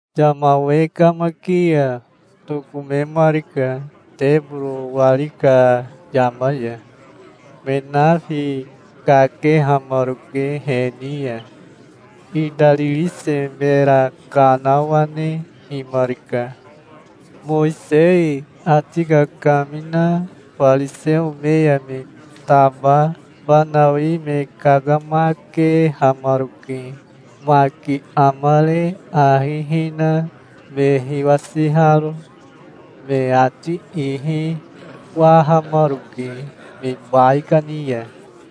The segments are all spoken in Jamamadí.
Yama we kamaki ya tokomemarika teboro wari ka yama ya. Me nafi kakehamaroke he ni ya. Itaririse mera kanawanehimarika. Mowisei ati kakamina fariseo me ya me taba fanawi me kakamakehamaroke, maki amare ahi hina me hiwasiharo. Me ati ihi wahamaroke me baikani ya.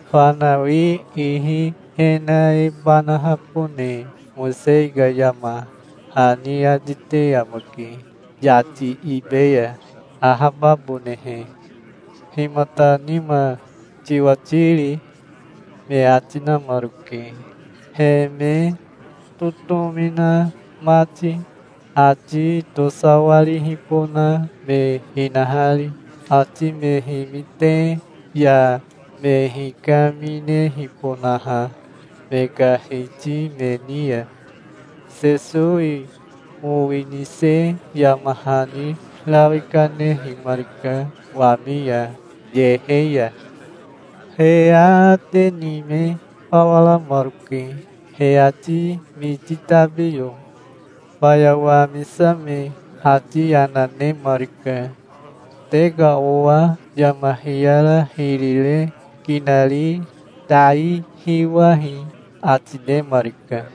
Fanawi ihi e na e banahabone Mowisei ka yama hani ati te amake yati ibe ya, ahababonehe. Himata nima tiwati ri?" me ati namaroke, he me totomi na mati, ati tosawarihibona me hinahari, ati me himite ya me hikaminehibonaha me ka hiti me ni ya. Sesowi mowi nise yama hani rawi kanehimarika wami ya, yehe ya. He aate ni me fawa ramaroke, he ati miti tabiyo. Faya wamisame ati yana nemarika. "Te ka owa yama hiyara hiri re kinari tai hiwahi", ati nemarika.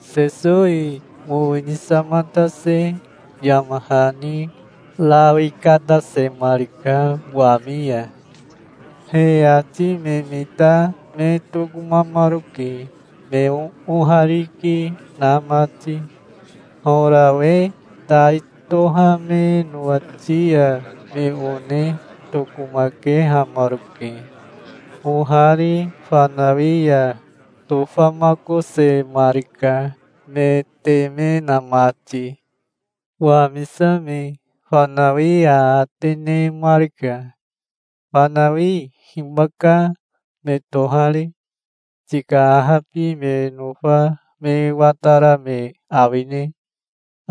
Sesowi mowi nisamatase yama hani rawi katasemarika wami ya. He ati me mita me tokomamaroke, me oohariki na mati. Horawe tai tohame nowati ya me one tokomakehamaroke. Ohari fanawi ya tofamakosemarika, me teme na mati. Wamisame fanawi aate nemarika. "Fanawi hibaka me tohari? Tika ahabi me nofa me watara me awine?"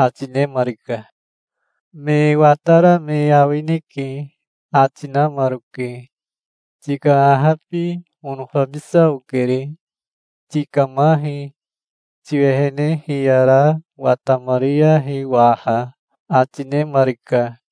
ati nemarika. "Me watara me awineke", ati namaroke. "Tika ahabi onofabisa okere. Tikamahi. Tiwehene hiyara watamariyahi waha", ati nemarika.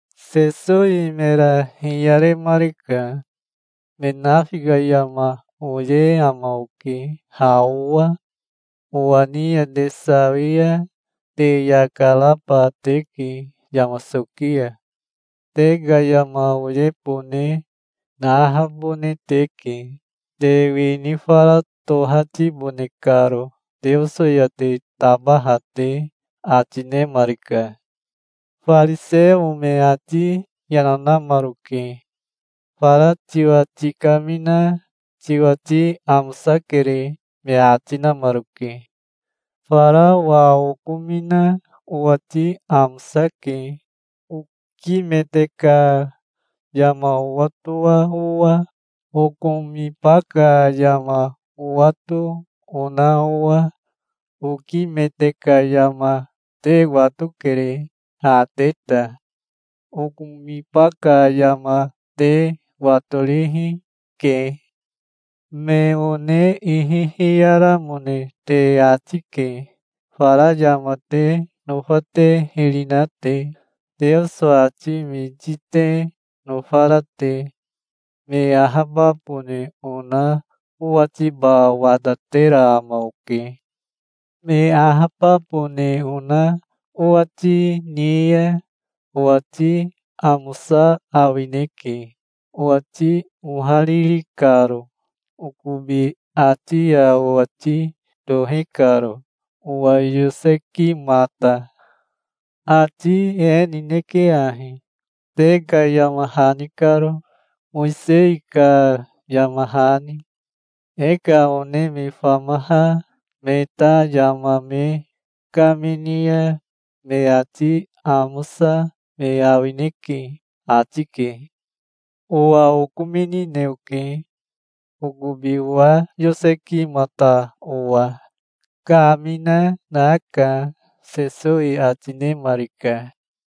Sesowi mera hiyaremarika. "Me nafi ka yama oye ama oke ha owa. Owa ni ya te sawi ya te yaka raba teke yama soki ya. Te ka yama oyebone nahabone teke, te wini fara tohatibone karo Teoso ya te tabaha te", ati nemarika. Fariseo me ati yana namaroke. "Fara tiwa tikamina tiwati amosakere", me ati namaroke. "Fara owa okomina owati amosake, okimete ka yama owatoa owa, okomiba ka yama owato ona owa. Okimete ka yama te watokere, ha te ta. Okomiba ka yama te watorihi, ke. Me one ihi hiyaramone te ati ke, fara yama te nofa te hiri na te, Teoso ati miti te nofara te. Me ahababone ona owatiba watatera ama oke. Me ahababone ona owati ni ya owati amosa awineke, owati ohariri karo, okobi ati ya owati tohi karo, owa yosekimata. Ati e nineke ahi, te ka yama hani karo, Mowisei ka yama hani: 'E ka one me famaha me ta yama me kamini ya, me ati amosa me awineke', ati ke. Owa okominine oke. Okobi owa yosekimata owa kamina naka", Sesowi ati nemarika.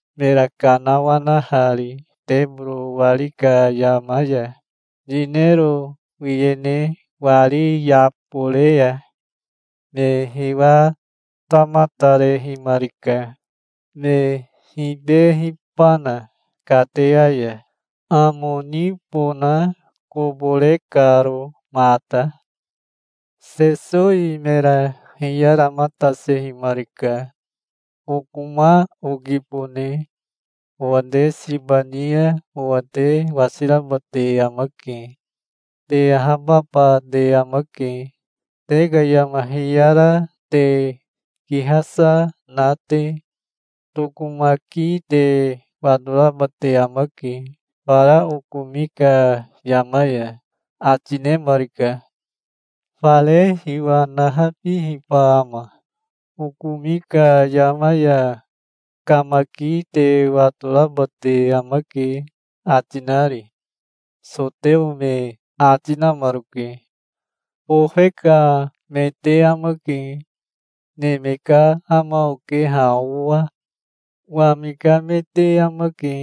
mera kanawanahari teboro wari ka yama ya, yinero wiyene wari yabore ya. Me hiwatamatarehimarika, me hibehibana kateya ya, amo nibona kobo re karo mata. Sesowi mera hiyaramatasehimarika. "Okoma okibone. Owa te siba ni ya owa te wasiraba te amake. Te ahababa te amake, te ka yama hiyara te kihasa na te. Tokomaki te watoraba te amake fara okomi ka yama ya", ati nemarika. "Fare hiwa nahabihiba ama, 'Okomi ka yama ya kamaki te watoraba te amake', ati nari?" soteo me ati namaroke. "Bofe ka me te amake. Neme ka ama oke ha owa. Wami ka me te amake.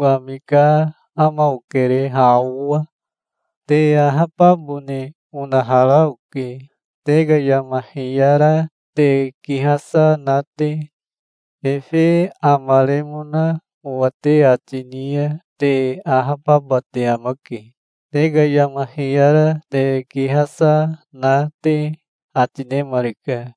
Wami ka ama okere ha owa. Te ahababone onahara oke, te ka yama hiyara te kihasa na te. Efe amaremona owa te ati ni ya te ahababa te amake, te ka yama hiyara te kihasa na te", ati nemarika.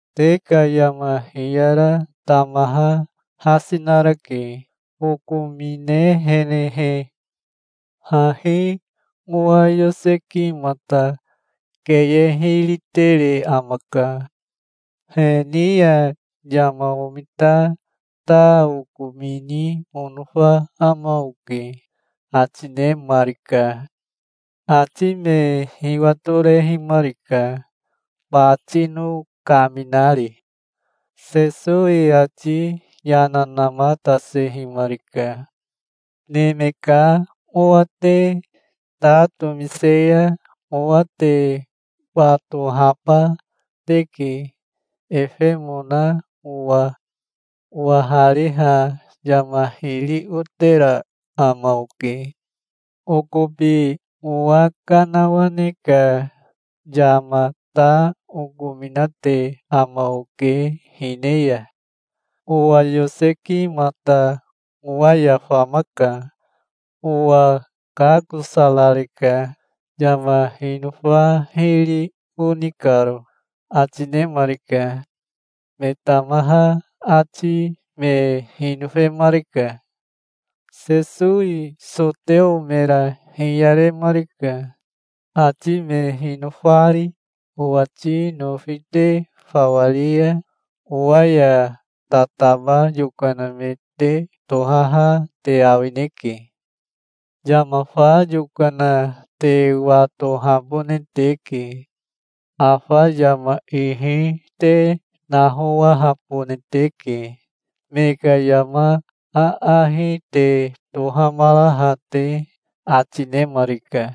Te ka yama hiyara tamaha hasi narake, okominehenehe. Hahi owa yosekimata keye hiri tere amaka. He ni ya yama omita ta okomini onofa ama oke", ati nemarika. Ati me hiwatorehimarika, batino kaminari. Sesowi ati yana namatasehimarika. "Neme ka Owa te ta tomise ya owa te watohaba teke, efemona owa. Owahariha yama hiri otera ama oke. Okobi owa kanawane ka yama ta okominate ama oke hine ya. Owa yosekimata owa ya famaka. Owa kakosarareka, yama hinofa hiri oni karo", ati nemarika. Me tamaha ati me hinofemarika. Sesowi soteo mera hiyaremarika, ati me hinofari. "Owati nofi te fawa ri ya owa ya tataba yokana me te tohaha te awineke. Yama fa yokana te watohabone teke. Afa yama ihi te nahowahabone teke, me ka yama aahi te tohamaraha te", ati nemarika.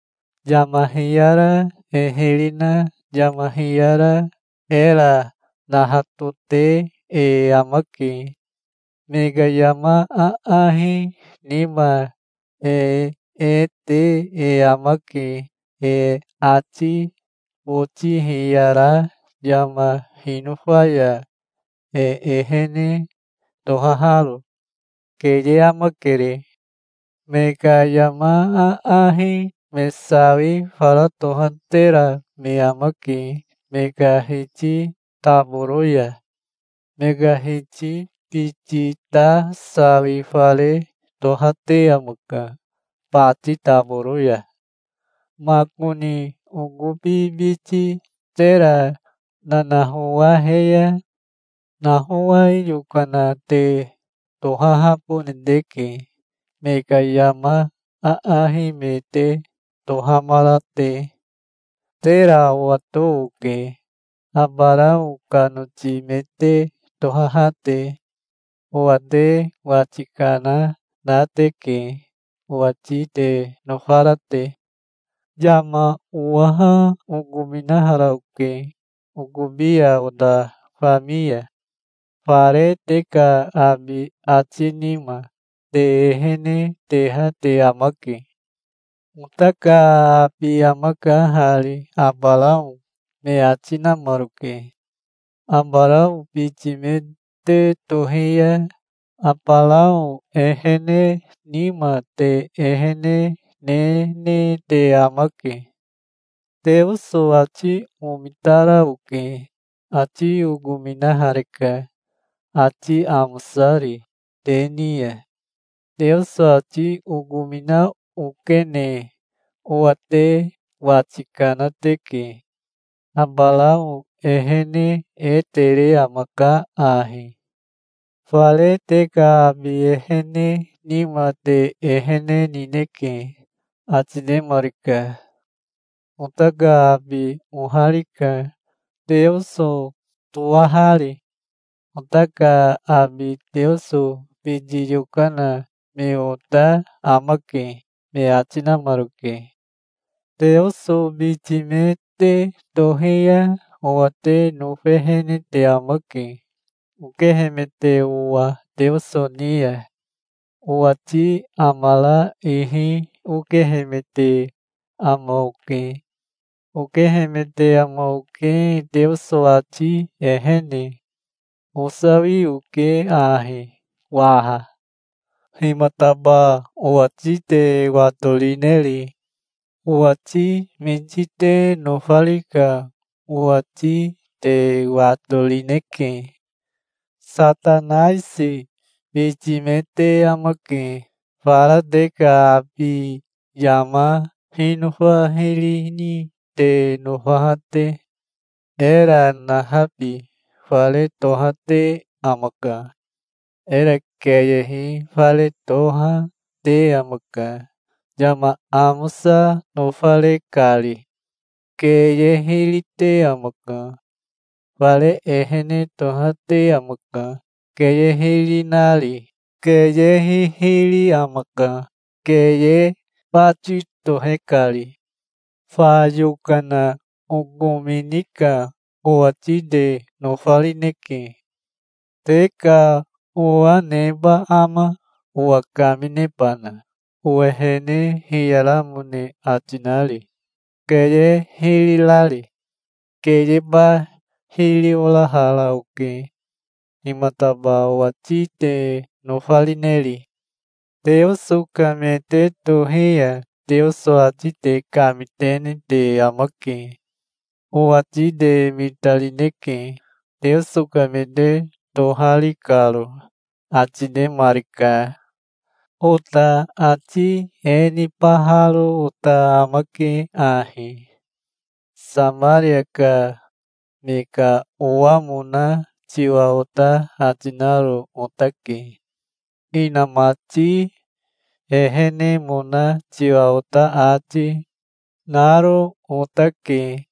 "Yama hiyara e hiri na yama hiyara era nahatote e amake. Me ka yama aahi nima e e te e amake, e ati boti hiyara yama hinofa ya e ehene tohaharo. Keye amakere. Me ka yama aahi me sawi fara tohatera me amake me ka hiti taboro ya. Me ka hiti biti ta sawi fare tohate amaka bati taboro ya. Makoni okobi biti tera nanahowahe ya nahowai yokana te tohahabone teke, me ka yama aahi me te tohamara te. Tera owato oke, Abarao ka noti me te tohaha te. Owa te wati kana na teke, owati te nofara te. Yama owaha okominahara oke, okobi ya ota fami ya. Fare te ka abi ati nima, te ehene teha te amake". "Ota ka abi amaka hari Abarao", me ati namaroke. "Abarao biti me te tohi ya Abarao ehene nima te ehene nene te amake. Teoso ati omitara oke. Ati okominahareka, ati amosari, te ni ya. Teoso ati okomina okene owa te wati kana teke. Abarao ehene e tere amaka ahi. Fare te ka abi ehene nima te ehene nineke", ati nemarika. "Ota ka abi oharika, Teoso toahari. Ota ka abi Teoso biti yokana me ota amake", me ati namaroke. "Teoso biti me te tohi ya owa te nofehene te amake, okehemete owa Teoso ni ya. Owati amara ihi okehemete ama oke. Okehemete ama oke Teoso ati ehene. Osawi oke ahi waha. Himataba owati te watorineri? Owati miti te nofari ka owati te watorineke. Satanaisi biti me te amake, fara te ka abi yama hinofa hiri ni te nofaha te. Era nahabi fare tohate amaka. Era keyehi fare toha, te amaka, yama amosa nofare kari. Keye hiri te amaka. Fare ehene tohate amaka, keye hiri nari. Keye hihiri amaka, keye bati tohe kari. Fa yokana okomini ka owati te nofarineke. Te ka owa neba ama, owa kaminebana, owehene hiyaramone ati nari, keye hiri rari? Keyeba hiri orahara oke. Himataba owati te nofarineri? Teoso ka me te tohi ya Teoso ati te kamitene te amake. Owati te mitarineke, Teoso ka me te tohari karo", ati nemarika. "Ota ati e nibaharo ota amake ahi: Samaria ka me ka owamona tiwa ota ati naro otake. Inamati ehenemona tiwa ota ati, naro otake.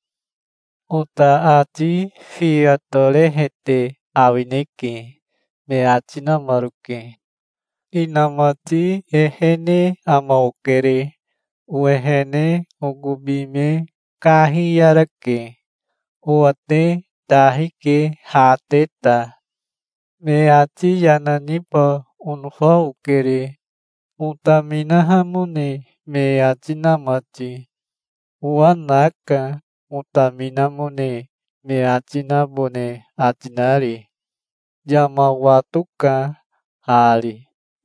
Ota ati fiya torehete awineke", me ati namaroke. "Inamati ehene ama okere. Owehene okobi me kahiyarake. Owa te tahi ke ha te ta. Me ati yana niba onofa okere, otaminahamone me ati na mati. Owa naka, otaminamone me ati nabone ati nari. Yama watoka hari,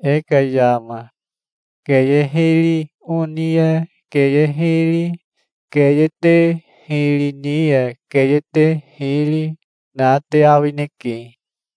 e ka yama. Keye hiri oni ya keye hiri, keye te hiri ni ya keye te hiri, na te awineke.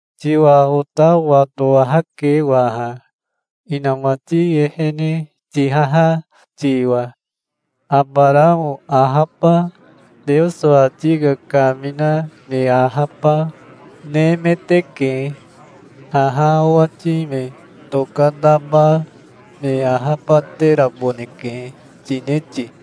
"Tiwa ota watowahake waha, inamati ehene tihaha tiwa. Abarao ahaba, Teoso ati kakamina me ahaba, nemeteke. 'Haha owati me tokataba me ahabateraboneke', tine ti?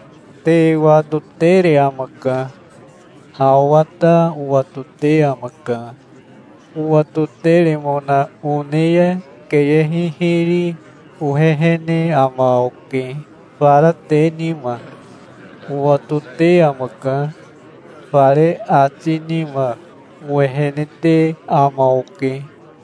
Te watotere amaka. Ha owa ta owatote amaka. Owatoteremona one ya keye hihiri ohehene ama oke, fara te nima. Owatote amaka. Fare ati nima owehene te ama oke.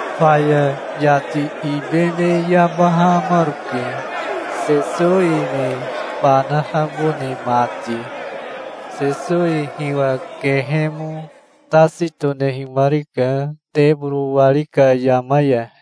Faya yati ibe me yabahamaroke, Sesowi me banahabone mati. Sesowi hiwa kehemo tasi tonehimarika teboro wari ka yama ya.